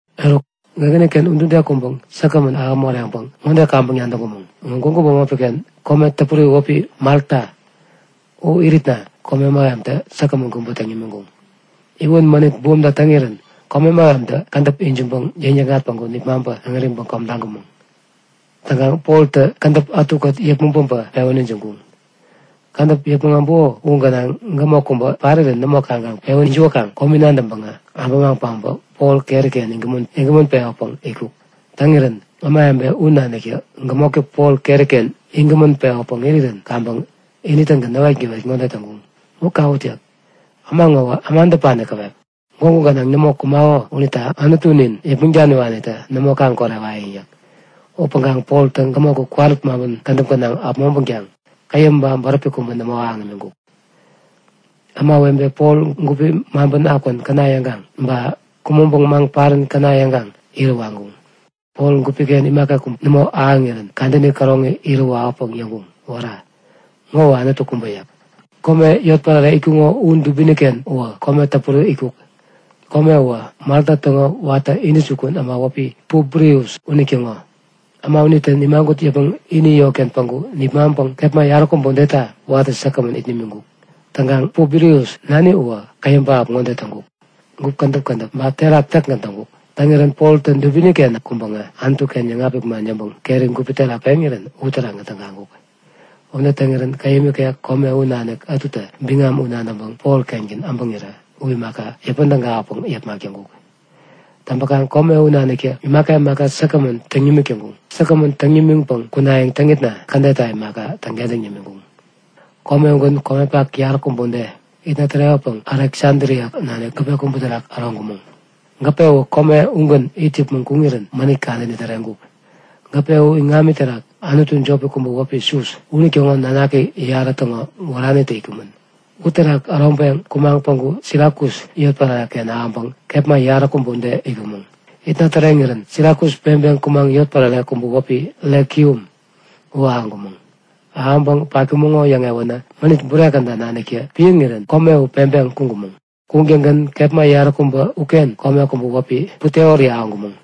Eruk gägäni-ken udude kudup säkgämän ahäŋ moreŋpäŋ ŋode kaŋpäŋ nadäŋkumäŋ; Ŋo gwägu bämopi-ken kome täpuri wäpi Malta. U iritna kome mähemtä säkgämän kubä täŋ nimiŋkuŋ. Iwän mänit bumta täŋirän kome mähemtä kädäp ijiŋpäŋ yäŋnikŋat päŋku nipmaŋpä äŋäriŋpäŋ kom taŋkumäŋ. Täŋkaŋ Poltä kädäp ätukät yäpmäŋ päbä pewän ijiŋkuŋ. Kädäp yäpmäŋ äbuko u gänaŋ gämok kubä parirän nämo kaŋkaŋ pewän jiwäkaŋ komi nadäŋpäŋä äbämaŋ päbä Pol keri-ken iŋgämän pewäpäŋ itkuk. Täŋirän ämawebe u naniktä gämoktä Pol keri-ken iŋgämän pewäpäŋ irirän kaŋpäŋ ini-tägän näwetgäwet ŋode täŋkuŋ; U kawut! yäk. Äma ŋowä äma däpani käwep! Gwägu gänaŋ nämo kumako unita anutunin Yäpmäŋ Daniwanitä nämo kaŋ-korewayäŋ yäk. Upäŋkaŋ Poltä gämok u kwarut maŋpän kädäp gänaŋ äpmoŋpänkaŋ käyäm ba bäräpi kubä nämo ahäŋ imiŋkuk. Ämawebe Pol gupi maŋpän akwän käna yäŋkaŋ, ba kumäŋpäŋ maŋ parän käna yäŋkaŋ irä waŋkuŋ. Pol gupi-ken imaka kubä nämo ahäŋirän kadäni käroŋi irä wawäpäŋ yäŋkuŋ; Wära! Ŋowä anutu kubä! yäk. Kome yotpärare itkuŋo u dubini-ken uwä kome täpuri itkuk. Kome uwä Malta täŋo watä intäjukun äma wäpi Publius unitäŋo. Äma unitä nimagut yäpmäŋ ini yotken päŋku nipmaŋpäŋ kepma yaräkubä udeta watä säkgämän it nimiŋkuk. Täŋkaŋ Publius nani uwä käyäm pähap ŋode täŋkuk; Gup kädäp kädäp ba terak täkgän täŋkuk. Täŋirän Poltä dubini-ken kuŋpäŋä Anutu-ken yäŋapik man yäŋpäŋ keri gupi terak peŋirän uterakgän tägaŋkuk. Ude täŋirän käyäm ikek kome u nanik ätutä biŋam u nadäŋpäŋ Pol-kengän äbäŋirä u imaka, yäpän tägawäpäŋ yepmak täŋkuk. Täŋpäkaŋ kome u naniktä imaka imaka säkgämän täŋ nimik täŋkuŋ. Säkgämän täŋ nimiŋpäŋ kunayäŋ täŋitna kädetta imaka, täŋkentäŋ nimiŋkuŋ. Kome ugän komepak yaräkubä ude itna tärewäpäŋ Aleksadria nanik gäpe kubä terak äroŋkumäŋ. Gäpe uwä kome ugän it yäpmäŋ kuŋirän mänit kadäni täreŋkuk. Gäpe u iŋami terak anutu jopi kubä wäpi Sus, unitäŋo nanaki yarä täŋo wäranitä itkumän. Uterak äroŋpeŋ kumaŋ päŋku Sirakus yotpärare-ken ahäŋpäŋ kepma yaräkubä ude itkumäŋ. Itna täreŋirän Sirakus peŋpeŋ kumaŋ yotpärare kubä wäpi Rekium u ahäŋkumäŋ. Ahäŋpäŋ patkumäŋo yäŋewänä mänit bure käda naniktä piäŋirän kome u peŋpeŋ kuŋkumäŋ. Kuŋtäŋgän kepma yaräkubä uken kome kubä wäpi Puteoli ahäŋkumäŋ.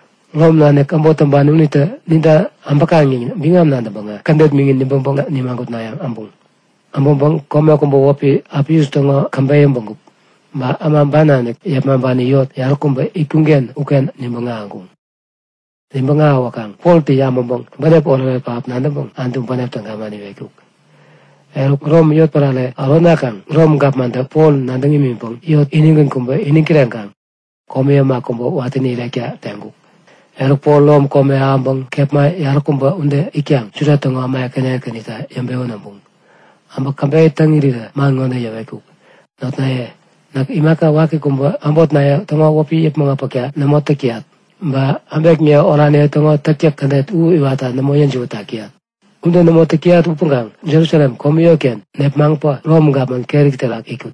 Rom nanik äbot täŋpani unitä ninta äbäkaŋ yäŋ biŋam nadäŋpäŋä kädet miŋin nibäŋpäŋ nimagutnayäŋ äbuŋ. Äbäŋpäŋ kome kubä wäpi Apius täŋo käbeyä bägup, ba Äma ban nanik yepmaŋpani yot yaräkubä itkuŋ-ken uken nibäŋ ahäŋkuŋ. Nibäŋ ahäwäkaŋ Poltä yabäŋpäŋ bänep oretoret pähap nadäŋpäŋ Anutu bänep täga man iwetkuk. Eruk Rom yotpärare äronakaŋ Rom gapmantä Pol nadäŋ imiŋpäŋ yot inigän kubä iniŋ kireŋkaŋ komi äma kubä watäni irekta teŋkuk. Eruk, Pol Rom kome ahäŋpäŋ kepma yaräkubä ude itkaŋ Juda täŋo äma ekäni ekänita yäŋpewän äbuŋ. Äbä käbeyä täŋ irirä man ŋode yäwetkuk; Notnaye, näk imaka waki kubä äbotniye täŋo wäpi yäpmäŋ äpäkta nämo täk täyat, ba äbekniye oraniye täŋo täktäk kädet u iwatta nämo yäjiwät tak täyat. Ude nämo täk täyat upäŋkaŋ Jerusalem komi yotken nepmaŋpä Rom gapman keri terak itkut.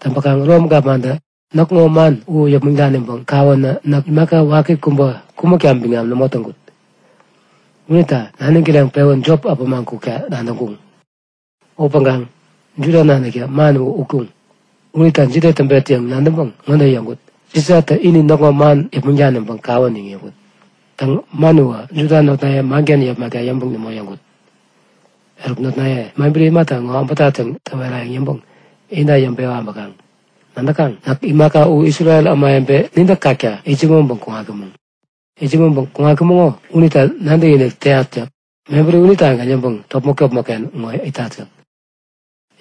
Täŋpakaŋ Rom gapmantä näkŋo man u yäpmäŋ daniŋpäŋ kawänä näk imaka waki kubä kumäkta biŋam nämo täŋkut. Unita naniŋ kireŋpewän jop äpämaŋ kukta nadäŋkuŋ. Upäŋkaŋ Juda naniktä man u utkuŋ. Unita jide täŋpet yäŋ nadäŋpäŋ ŋode yäŋkut; Sisatä ini näkŋo man yäpmäŋ daniŋpäŋ kaŋ kawän yäŋ yäŋkut. Täŋ, man uwä Juda notnaye manken yepmakta yäŋpäŋ nämo yäŋkut. Eruk notnaye, mebäri imata ŋo äbätat yäŋ täwerayäŋ yäŋpäŋ inta yäŋpewa äbäkaŋ. Nadäkaŋ? Näk imaka u Isrel ämawebe nintä kakta itsämäŋpäŋ kuŋatkumäŋ unita nadäkinik täyat yäk. Mebäri unitagän yäŋpäŋ topmäk-topmäkken ŋo itat yäk.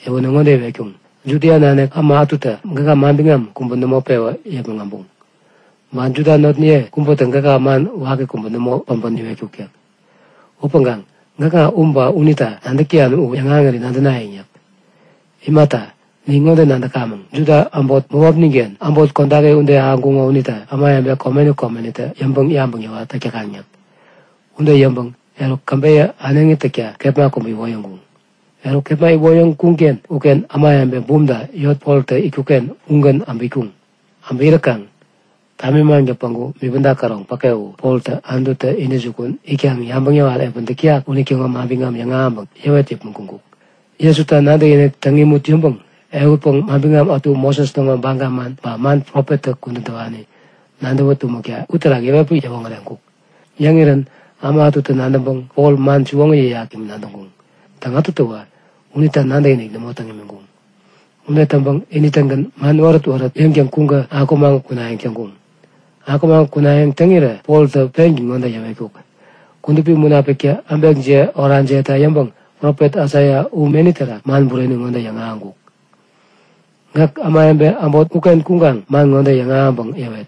Yäwänä ŋode iwetkuŋ; Judia nanik äma ätutä gäka manbiŋam kubä nämo pewä yäpmäŋ äbuŋ. Ba Juda notniye kubätä gäka man waki kubä nämo päbä niwetkuk yäk. Upäŋkaŋ gäkŋa u ba unita nadäk täyan u yäŋahäŋiri nadänayäŋ yäk. Imata, nin ŋode nadäkamäŋ; Juda äbot bämopnin-ken äbot kodaki ude ahäŋkuŋo unita ämawebe komeni komenitä yäŋpäŋ-yabäŋ yäwat täk täkaŋ yäk. Ude yäŋpäŋ eruk käbeyä äneŋi täkta kepma kubä iwoyäŋkuŋ. Eruk kepma iwoyäŋkuŋ-ken uken ämawebe bumta yot Poltä itkuk-ken ugän äbä itkuŋ. Äbä iräkaŋ tamimaŋtä päŋku bipäda käroŋ päke uwä Poltä Anututä intäjukun itkaŋ yabäŋ yäwat epäni täk täyak unitäŋo manbiŋam yäŋahäŋpäŋ yäwet yäpmäŋ kuŋkuk. Jesuta nadäkinik täŋ imut yäŋpäŋ ehutpäŋ manbiŋam ätu Moses täŋo baga man ba man profettä kudän täwani nadäwä tumäkta uterak yäwetpäŋ yäwoŋäreŋkuk. Yäŋirän äma ätutä nadäŋpäŋ Pol man siwoŋi yäyak yäŋ nadäŋkuŋ. Täŋ, ätutäwä unita nadäkinik nämo täŋ imiŋkuŋ. Ude täŋpäŋ ini-tägän man wärät-wärät yäŋtäŋ kuŋkä akumaŋ kunayäŋ täŋkuŋ. Akumaŋ kunayäŋ täŋirä Poltä pengän ŋode yäwetkuk; Kudupi Munapiktä äbekjiye orajiyeta yäŋpäŋ profet Aisaia u meni terak man bureni ŋode yäŋahäŋkuk; Gäk ämawebe äbot uken kuŋkaŋ man ŋode yäŋahäŋpäŋ yäwet;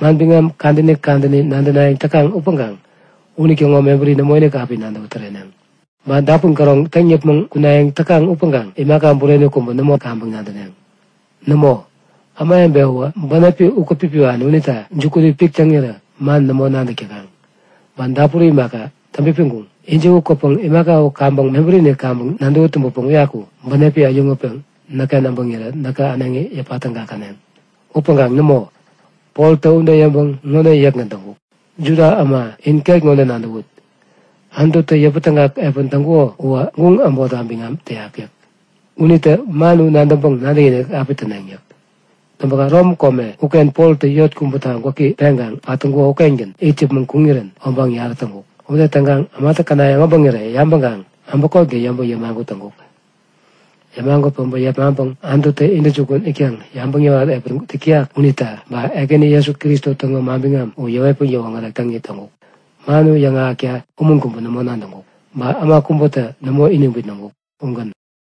Manbiŋam kadäni kadäni nadänayäŋ täkaŋ upäŋkaŋ unitäŋo mebäri nämoinik api nadäwä tumneŋ. Ba dapun käroŋ täŋ yäpmäŋ kunayäŋ täkaŋ upäŋkaŋ imaka bureni kubä nämo api kaŋpäŋ nadäneŋ. Nämo, ämawebe uwä bänepi ukät-pipiwani unita jukuni pik täŋirä man nämo nadäk täkaŋ, ba dapuri imaka, täŋpipiŋkuŋ. Ijiwä kwäpäŋ imaka u kaŋpäŋ mebärini kaŋpäŋ nadäwä tumbäpäŋ uyaku bänepi äyäŋutpeŋ näkken äbäŋirä näkä äneŋi yäpa tägakäneŋ. Upäŋkaŋ nämo! Poltä ude yäŋpäŋ ŋode yäkgän täŋkuk; Juda äma in, ket ŋode nadäwut; Anututä yäpätägak epän täŋkuko uwä guŋ äbotta biŋam täyak yäk. Unitä man u nadäŋpäŋ nadäkinik api täneŋ! yäk. Täŋpäkaŋ Rom kome uken Poltä yot kubäta gwäki peŋkaŋ pat täŋkuko ukengän it yäpmäŋ kuŋirän obaŋ yarä täŋkuk. Ude täŋkaŋ ämatä känayäŋ äbäŋirä yabäŋkaŋ äbäkotgän yäŋpäŋ yämagut täŋkuk. Yämagut päbä yepmaŋpäŋ Anututä intäjukun itkaŋ yabäŋ yäwat epäni täk täyak unita, ba Ekäni Jesu Kristo täŋo manbiŋam u yäwetpäŋ yäwoŋärek täŋit täŋkuk. Man u yäŋahäkta umun kubä nämo nadäŋkuk, ba äma kubätä nämo iniŋ bitnäŋkuk. Ugän.